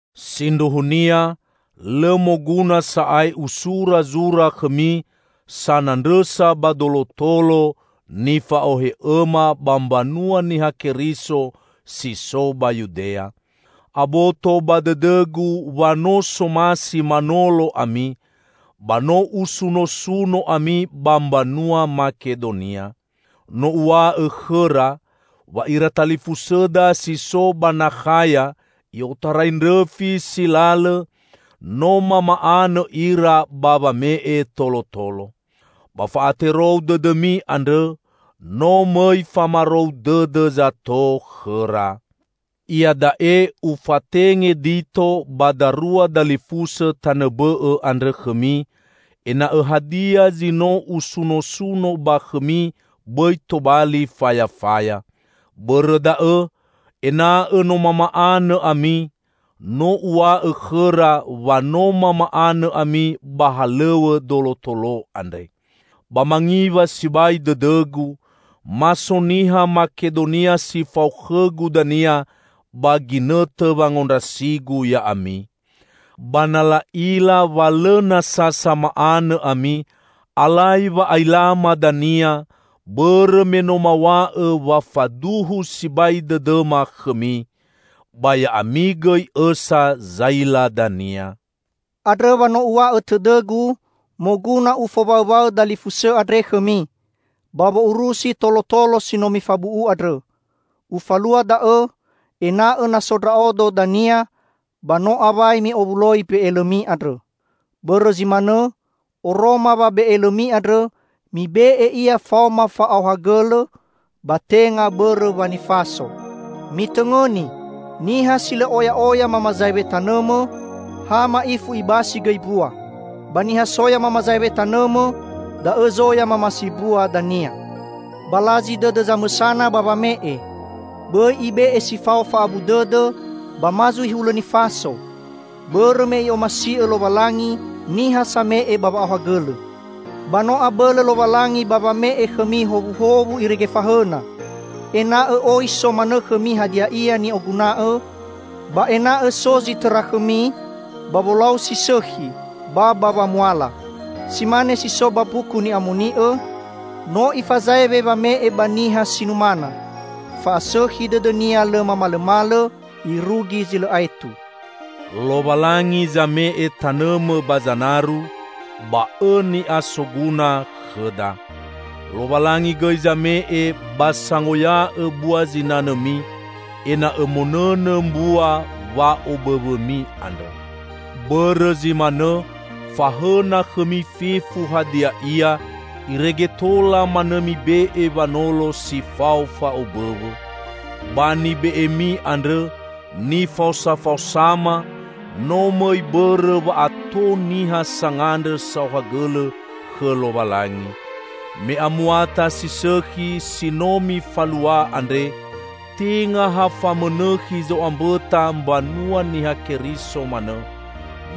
Sindruhunia, lõ moguna sa'ae usura zura khõmi sanandrõsa ba dolotolo nifa'ohe'õma ba mbanua Niha Keriso si so ba Yudea. Aboto ba dõdõgu wa no somasi manolo ami, ba no usunosuno ami ba mbanua Makedonia. No uw̃a'õ khõra, wa ira talifusõda si so ba Nakhaya i'otarai ndrõfi si lalõ no mama'anõ ira ba wame'e tolotolo. Ba fa'aterou dõdõmi andrõ no mõi famarou dõdõ zato khõra. Iada'e ufatenge Dito ba darua dalifusõ tanõ bõ'õ andrõ khõmi, ena'õ hadia zi no usunosuno ba khõmi bõi tobali fayafaya. Bõrõ da'õ, ena'õ no mama'anõ ami, no uw̃a'õ khõra wa no mama'anõ ami ba halõw̃õ dolotolo andre. Ba mangiwa sibai dõdõgu, ma so niha Makedonia si fao khõgu dania ba ginõtõ wangondrasigu ya'ami. Ba na la'ila wa lõ nasa sama'anõ ami, alai wa'ailama dania, bõrõ me no maw̃a'õ wa faduhu sibai dõdõma khõmi! Ba ya'ami gõi õsa zaila dania. Andrõ wa no uw̃a'õ tõdõgu moguna ufowaõwaõ dalifusõ andre khõmi, ba wo'urusi tolotolo si no mifabu'u andrõ. Ufalua da'õ, ena'õ na so ndra'odo dania, ba no awai mi'owuloi mbe'elõmi andrõ. Bõrõ zi manõ, oroma wa be'elõmi andrõ, mibe'e ia faoma fa'aohagõlõ, ba tenga bõrõ wa nifaso. Mitõngõni! Niha si lõ oya'oya mamazaewe tanõmõ, ha ma'ifu ibasi gõi mbua. Ba niha soya mamazaewe tanõmõ, da'õ zoya mamasi mbua dania. Balazi dõdõ zamõsana ba wame'e. Bõi ibe'e si fao fa'abu dõdõ, ba ma zui hulõ nifaso, bõrõ me I'omasi'õ Lowalangi niha same'e ba wa'aohagõlõ. Ba no abõlõ Lowalangi ba wame'e khõmi howuhowu irege fahõna, ena'õ oi so manõ khõmi hadia ia ni'oguna'õ; ba ena'õ so zi tõra khõmi, ba wolau si sõkhi, ba ba wamuala. Si mane si so ba Mbuku Ni'amoni'õ, "No Ifazaewe wame'e ba niha si numana; fa'asõkhi dõdõ-Nia lõ mamalõmalõ irugi zi lõ aetu." Lowalangi zame'e tanõmõ ba zanaru, ba õ ni'a soguna khõda. Lowalangi gõi zame'e ba sangoya'õ bua zinanõmi, ena'õ monõnõ mbua wa'obõwõmi andrõ. Bõrõ zi manõ, fahõna khõmi fefu hadia ia irege tola manõ mibe'e wanolo si fao fa'obõwõ. Ba nibe'emi andrõ nifaosafaosama, no mõi bõrõ wa ato niha sangandrõ saohagõlõ khõ Lowalangi. Me amuata si sõkhi si no mifalua andre tenga ha famõnõkhi zo'ambõta mbanua Niha Keriso manõ,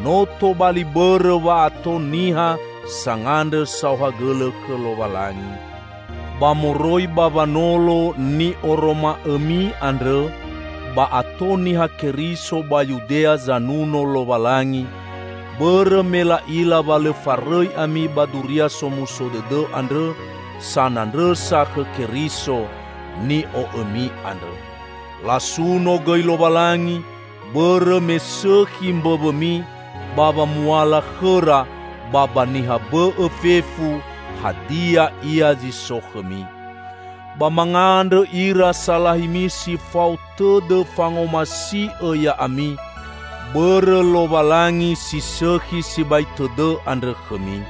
no tobali bõrõ wa ato niha sangandrõ saohagõlõ khõ Lowalangi. Ba moroi ba wanolo ni'oroma'õmi andrõ, ba ato Niha Keriso ba Yudea zanuno Lowalangi, bõrõ me la'ila wa lõ farõi ami ba Duria Somuso Dõdõ andrõ sanandrõsa khõ Keriso, ni'o'õmi andrõ. Lasuno gõi Lowalangi bõrõ me sõkhi mbõwõmi ba wamuala khõra ba ba niha bõ'õ fefu, hadia ia zi so khõmi. Ba mangandrõ ira salahimi si fao tõdõ fangomasi'õ ya'ami, bõrõ Lowalangi si sõkhi sibai tõdõ andrõ khõmi.